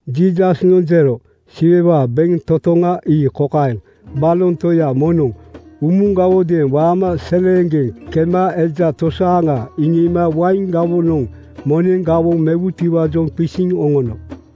Jiisasnoŋ jero, “Siwewaa bentotoŋa ii kokaeŋ: Baloŋ toya moŋnoŋ umugawodeeŋ waama seleeŋgeŋ kema eja tosaaŋa iŋiima wain gawoŋanoŋ moneŋ gawoŋ mewutiwaajoŋ qisiŋ oŋono.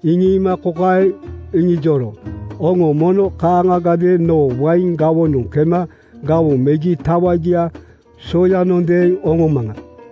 Iŋiima kokaeŋ iŋijoro, ‘Oŋo mono kaaŋagadeeŋ noo wain gawonanoŋ kema gawoŋ megi tawagia soyanondeeŋ oŋomaŋa.’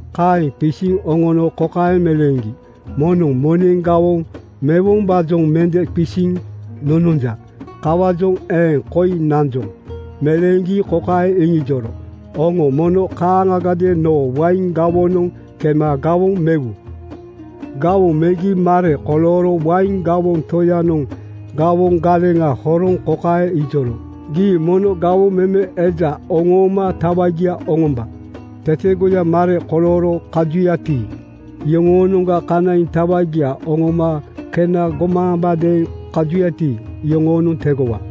“Kaeŋ qisiŋ oŋono kokaeŋ meleeŋgi, ‘Moŋnoŋ moneŋ gawoŋ mewombaajoŋ mende qisiŋ nononja. Kawaajoŋ eeŋ koi nanjoŋ.’ Meleeŋgi kokaeŋ iŋijoro, ‘Oŋo mono kaaŋagadeeŋ noo wain gawonanoŋ kema gawoŋ mewu.’ Gawoŋ megi mare kolooro wain gawoŋ toyanoŋ gawoŋ galeŋa horoŋ kokaeŋ ijoro, ‘Gii mono gawoŋ meme eja oŋooma tawagia oŋomba. Tetegoya mare kolooro kajuyati, iyoŋoonoŋga kanaiŋ tawagia oŋoma kena gomaambadeeŋ kajuyati, iyoŋoonoŋ tegowa.’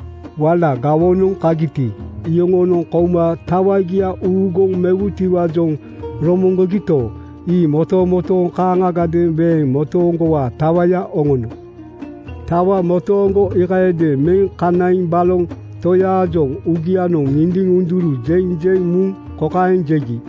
Wala gawonoŋ kagiti, iyoŋonoŋ kouma tawagia uuguŋ mewutiwaajoŋ romoŋgogito, ii motomotooŋ kaaŋagadeeŋ weeŋ motooŋgowaa tawaya oŋono. Tawa motooŋgo iikayadeeŋ meŋ kanaiŋ baloŋ toyaajoŋ uugianoŋ ŋindiŋ-ŋunduru jeŋ jeŋ muŋ kokaeŋ jegi,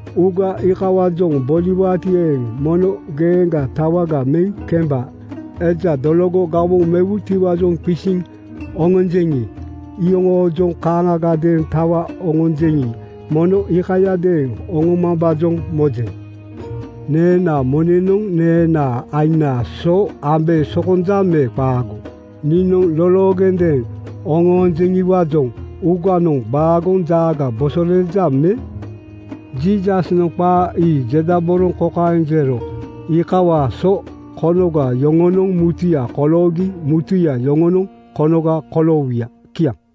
Uuga iikawaajoŋ boliwaati eeŋ, mono geeŋgaa tawaga meŋ kemba. Eja dologo gawoŋ mewutiwaajoŋ qisiŋ oŋonjeŋi, iyoŋoojoŋ kaaŋagadeeŋ tawa gonjeŋi, mono iikayadeeŋ oŋomambaajoŋ mojeŋ. ‘Neenaa moneŋnoŋ neenaa aiŋnaa so ambe sokonja me qaago? Niinoŋ loloogendeeŋ oŋonjeŋiwaajoŋ uuganoŋ baagoŋ jaaga bosoleeja me?” ’ Jiisasnoŋ qaa ii jedaboroŋ kokaeŋ jero, “Iikawaa so konoga yoŋonoŋ mutuya koloogi mutuya yoŋonoŋ konoga koloowuya.” Kiaŋ.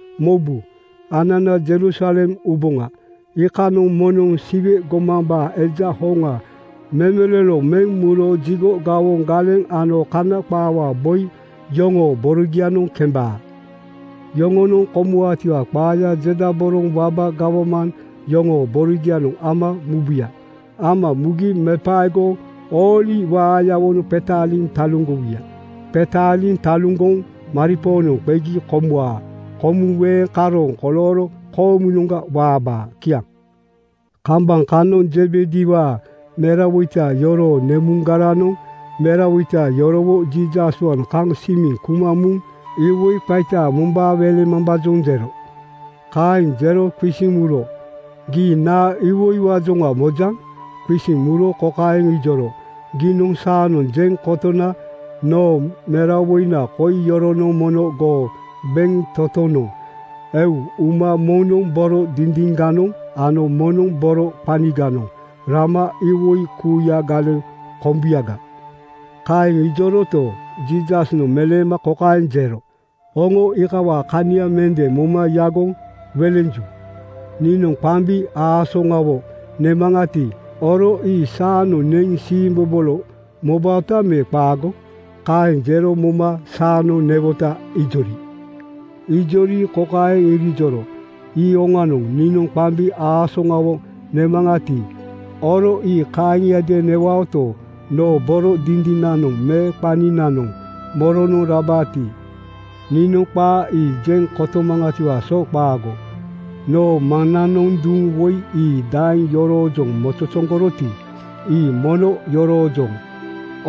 “Mobu, anana Jerusalem uboŋa. Iikanoŋ moŋnoŋ Siwe gomambaa Eja hoŋa memelolo meŋ muro jigo gawoŋ galeŋ ano Kana qaawaa boi yoŋoo borogianoŋ kembaa. Yoŋonoŋ komuwaatiwaa qaaya jedaboroŋ waba gawman yoŋoo borogianoŋ ama mubuya. Ama mugi mepaegoŋ ooli waayawonoŋ qetaaliŋ taluŋgowuya. Qetaaliŋ taluŋgoŋ maripoonoŋ qegi komuwaa. Komuŋ weeŋ karooŋ kolooro koomunoŋga waabaa.” Kiaŋ. Kambaŋ kanoŋ Zebediwaa merawoita yoroo nemuŋgaranoŋ merawoita yorowo Jiisaswaanoŋ kaŋ simiŋ kuma muŋ iwoi qaita mombaa welemambaajoŋ jero. Kaeŋ jero qisiŋ muro, “Gii naa iwoiwaajoŋa mojaŋ?” Qisiŋ muro kokaeŋ ijoro, “Giinoŋ saanoŋ jeŋ kotona noo merawoina koi yoronoŋ mono goo bentotonoŋ eu uma moŋnoŋ boro dindiŋganoŋ ano moŋnoŋ boro qaniganoŋ rama iwoi kuuya galeŋ kombuyaga.” Kaeŋ ijoroto, Jiisasnoŋ meleema kokaeŋ jero, “Oŋo iikawaa kania mende moma yagoŋ welenju. Niinoŋ qambi aasoŋawo nemaŋati, oro ii saanoŋ neŋ siimbobolo mobaota me qaago?” Kaeŋ jero moma “Saanoŋ newota,” ijori. Ijori kokaeŋ irijoro, “Ii oŋanoŋ! Niinoŋ qambi aasoŋawo nemaŋati, oro ii kaaŋiadeeŋ newaoto, noo boro dindinanoŋ me qaninanoŋ moronoŋ rabaati, niinoŋ qaa ii jeŋ kotomaŋatiwaa so qaago. Noo Maŋnanoŋ duŋ woi ii daeŋ yoroojoŋ mozozoŋgoroti, ii mono yoroojoŋ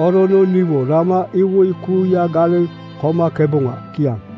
orono niwo rama iwoi kuuya galeŋ komakeboŋa.” Kiaŋ.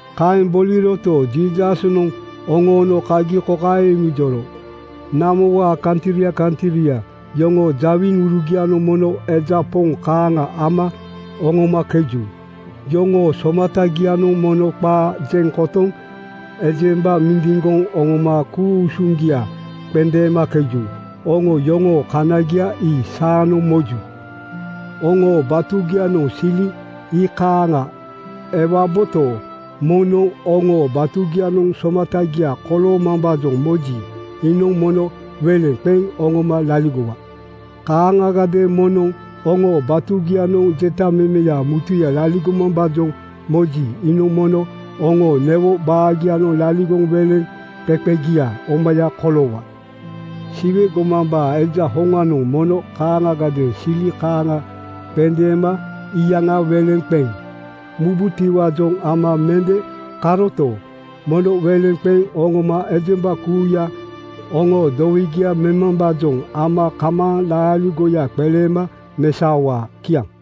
Kaeŋ boliroto, Jiisasnoŋ oŋoono kagi kokaeŋ iŋijoro, “Namowaa kantria kantria yoŋoo jawiŋurugianoŋ mono eja poŋ kaaŋa ama oŋomakeju. Yoŋoo somatagianoŋ mono qaa jeŋ kotoŋ ejemba mindiŋgoŋ oŋoma ku-usuŋgia qendeemakeju. Oŋo yoŋoo kaniagia ii saanoŋ moju. Oŋoo batugianoŋ sili iikaaŋa ewaboto, moŋnoŋ oŋoo batugianoŋ somatagia koloomambaajoŋ moji, iinoŋ mono weleŋ qeŋ oŋoma laligowa. “Kaaŋagadeeŋ moŋnoŋ oŋoo batugianoŋ jetamemeya mutuya laligomambaajoŋ moji, iinoŋ mono oŋoo newo baagianoŋ laligoŋ weleŋqeqegia omaya koloowa. Siwe gomambaa Eja hoŋanoŋ mono kaaŋagadeeŋ sili kaaŋa qendeema iyaŋa weleŋ qeŋ mubutiwaajoŋ ama mende karoto, mono weleŋ qeŋ oŋoma ejemba kuuya oŋoo dowegia memambaajoŋ ama kamaaŋ laaligoya qeleema mesaowaa.” Kiaŋ.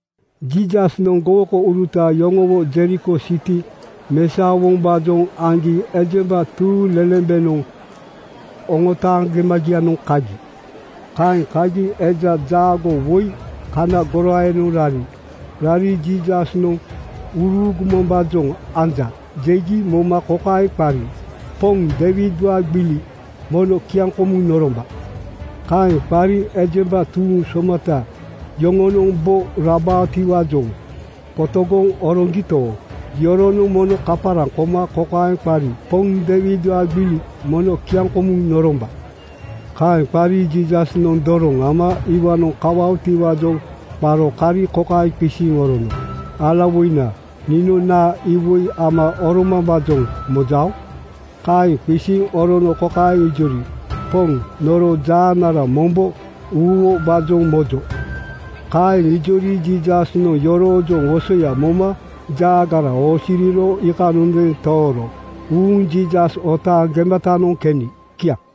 Jiisasnoŋ gowokouruta yoŋowo Jeriko siti mesaowombaajoŋ aŋgi ejemba tuuŋlelembenoŋ oŋotaaŋ gemagianoŋ kagi. Kaeŋ kagi eja jaagoo woi kana goraayanoŋ rari. Rari “Jiisasnoŋ uruugumambaajoŋ anja,” jegi moma kokaeŋ qari, “Poŋ Deiwidwaa gbili, mono kiaŋkomuŋ noromba!” Kaeŋ qari ejemba tuuŋ somata yoŋonoŋ bo rabaotiwaajoŋ qotogoŋ oroŋgito, iyoronoŋ mono kaparaŋ koma kokaeŋ qari, “Poŋ Deiwidwaa gbili, mono kiaŋkomuŋ noromba!” Kaeŋ qari Jiisasnoŋ doroŋ ama iwaanoŋ kawaotiwaajoŋ qaro kari kokaeŋ qisiŋ orono, “Alawoina, niinoŋ naa iwoi ama oromambaajoŋ mojao?” Kaeŋ qisiŋ orono kokaeŋ ijori, “Poŋ, noro jaanara mombo uuwobaajoŋ mojo.” Kaeŋ ijori Jiisasnoŋ yoroojoŋ wosoya moma jaagara oosiriro iikanondeeŋ tooro uuŋ Jiisas otaaŋ gematanoŋ keni. Kiaŋ.